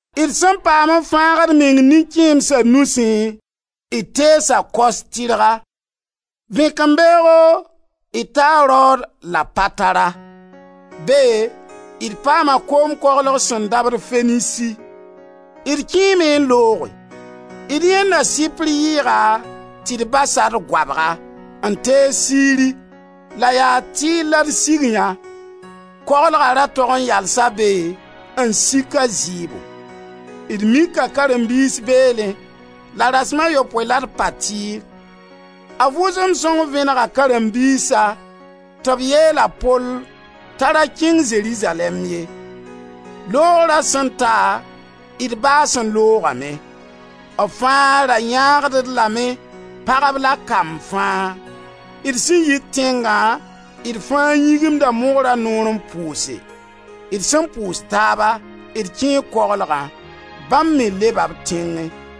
D sẽn paam n fãagd d meng nin-kẽemsa nusẽ, d teesa Kos tɩrga. Vẽkembeoogo d taa Rod la Patara. Be d paama koom koglg sẽn dabd Fenisi. D kẽeme n looge. D yãenda Sɩpr yɩɩga tɩ d bas-a d goabga, n tees Siri la yaa Tir la d sig yã. Koglga ra tog n yalsa be n sik a zɩɩbo. D mika karen-biis beelẽ la rasem a yopoe la d paa Tir. A Vʋʋsem Sõng vẽnega karen-biisa tɩ b yeel a Pol t'a ra kẽng Zerizalɛɛm ye. Loogra sẽn ta d baas n loogame. B fãa ra yãagd-d lame, pagb la kamb fãa. D sẽn yi tẽngã d fãa yĩgimda mogra noor n pʋʋse. D sẽn pʋʋs taaba, d kẽe koglgã. Bãmb me leba b tẽngẽ.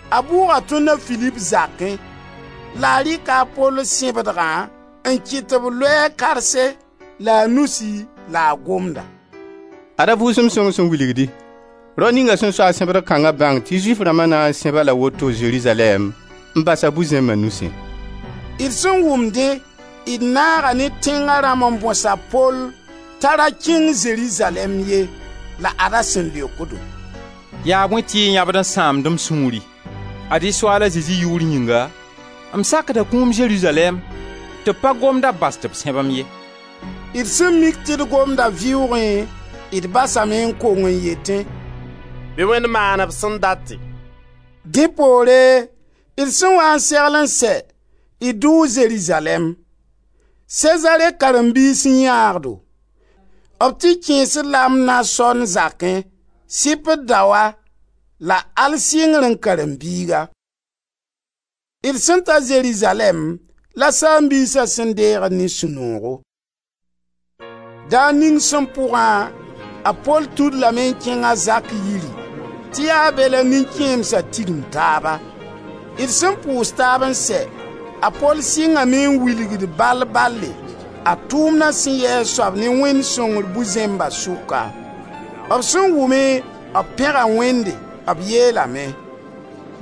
A bʋʋga tõnd a Filip zakẽ la a rɩka a Pol sẽbdgã n kɩt tɩ b loe a karse la a nusi la a gomda: «Ad-a Vʋʋsem Sõng sẽn wilgdi: Rao ninga sẽn soa sẽbdg kãnga bãng tɩ Zʋɩf rãmba na n sẽb-a la woto Zerizalɛɛm n bas-a bu-zẽmba nusẽ.» D sẽn wʋm dẽ, d naaga ne tẽnga rãmb n bõs a Pol t'a ra keng Zerizalɛɛm ye. La ad-a sẽn leok-do: «Yaa bõe tɩ y yãbd n sãamd m sũuri? Ad-y Soaal a Zezi yʋʋr yĩnga m sakda kũum Zerizalɛɛm tɩ b pa gomda bas tɩ b sẽb-m ye.» D sẽn mik tɩ d gomda vɩʋʋgẽ d basame n kong n yetẽ: «Bɩ Wẽnd maan b sẽn date.» Dẽ poore, d sẽn waa n segl n sɛ, d dʋ Zerizalɛɛm. Sezare karen-biis n yãag-do. B tɩ kẽes-d la a Mnason zakẽ, Sɩpr daoa la al sɩngrẽ karen-biiga. D sẽn ta Zerizalɛɛm la saam-biisa sẽn deeg-d ne sũ-noogo. Daar ning sẽn pʋgã, a Pol tũ-d lame n kẽng a Zak yiri tɩ yaa be la nin-kẽemsa tigim taaba. D sẽn pʋʋs taab n sɛ, a Pol sɩngame n wilgd bal-bale a tʋʋmda sẽn yɩ a soab ne Wẽnd sõngr bu-zẽmba sʋka. B sẽn wʋme b pẽga Wẽnde. B yeelame: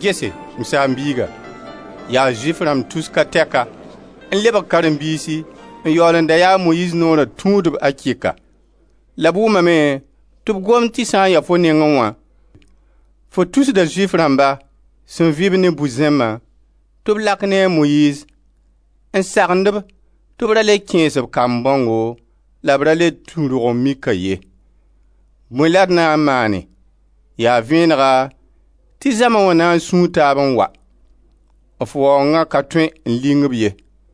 «Gese, m saam-biiga, yaa Zʋɩf rãmb tus ka tɛka n lebg karen-biisi n yaool n da yaa a Moyiiz Noora tũudb akɩka. La b wʋmame tɩ b gomd tɩ sã n ya fo nengẽ wã, fo tusda Zʋɩf rãmba sẽn vɩb ne bu-zẽmbã tɩ b lak ne a Moyiiz, n sagend-b tɩ b ra le kẽes b kamb bãongo la b ra le tũ rog-n-mika ye. Bõe la d na maane? Yaa vẽnega tɩ zãma na n sũu taab n wa. F waoonga ka tõe n ling b ye.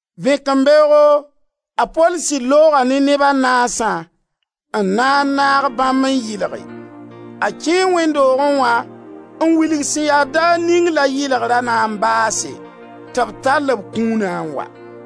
Vẽkembeoogo, a Pol sɩd looga ne neb a naasã n na n naag bãmb n yɩlge. A kẽe wẽnd doogẽ wã n wilg sẽn ya daar ning la yɩlgra na n baase tɩ b tall b kũuna n wa.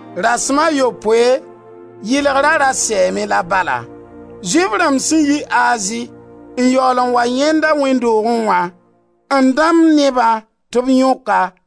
Rasem a yopoe yɩlgra ra sɛɛme la bala. Zʋɩf rãmb sẽn yit Azi n yaool n wa yãend-a wẽnd doogẽ wã, n dãmb nebã tɩ b yõk-a,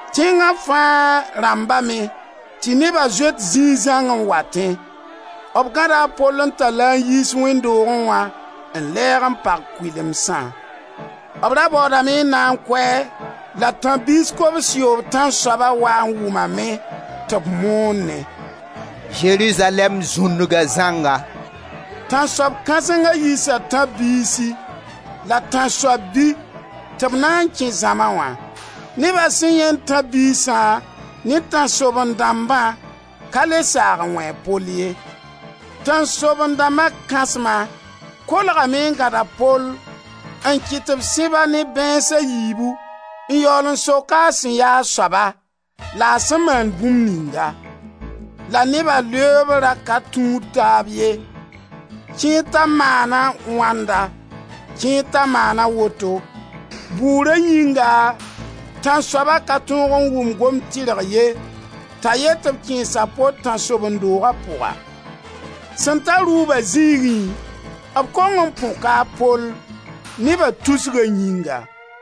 Tẽnga fãa rãmbame tɩ neba zoet zĩig zãng n watẽ. B gãda a Pol n tall-a n yiis wẽnd doogẽ wã, n lɛɛg n pag kʋɩlemsã. B ra baoodame n na n kʋ-a, la tãb-biis kobs-yoob tãnsoaba waa n wʋma me tɩ b moonẽ: «Zerizalɛɛm zũndga zãnga.» Tãnsoab kãsenga yiisa tãb-biisi la tãnsoab-bi tɩ b na n kẽ zãma wã. Neba sẽn yãend tãb-biisa ne b tãnsoaben-dãmbã ka le saag n wẽ a Pol ye. Tãnsoaben-dãmba kãsma kolgame n gãd a Pol n kɩt tɩ b sẽb-a ne bãeens a yiibu n yaool n sok-a a sẽn ya a soaba la a sẽn maan bũmb ninga. La neba leoob ra ka tũud taab ye, kẽer t'a maana wãnda, kẽer t'a maana woto. Bʋʋra yĩnga tãnsoaba ka tõog n wʋm gomd tirg ye t'a yet tɩ b kẽes a Pol tãnsoben-dooga pʋga. Sẽn ta rʋʋba zĩigẽ, b kong n põka a Pol, neba tusga yĩnga.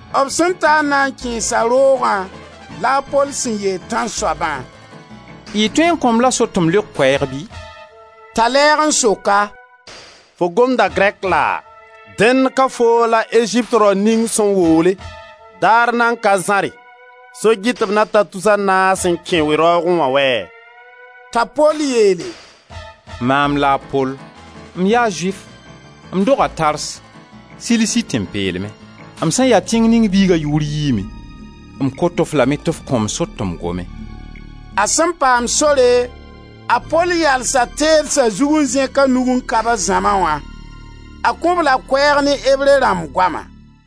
B sẽn ta n na n kẽes-a roogã la a Pol sẽn yeel tãnsoabã: «Y tõe n kõ-m la sor tɩ m leok koɛɛg bɩ?» T'a lɛɛg n sok-a: «Fo gomda grɛk laa? Dẽnd ka foo la Ezipt rao ning sẽn woole, daar nan ka zãre, so-gɩtb na ta tus a naas n kẽ we-raoogẽ wã wɛ?» T'a Pol yeele: «Maam la a Pol, m yaa Zʋɩf, m doga Tars, Silisi tẽn-peelmẽ. M sẽn ya tẽng ning tẽnga biiga yʋʋr yiime. M kot-f lame tɩ f kõ-m sor tɩ m gome.» A sẽn paam sore, a Pol yalsa teedsa zug, n zẽk a nug n kabs zãma wã. A kõ-b la koɛɛg ne Ebre rãmb goama: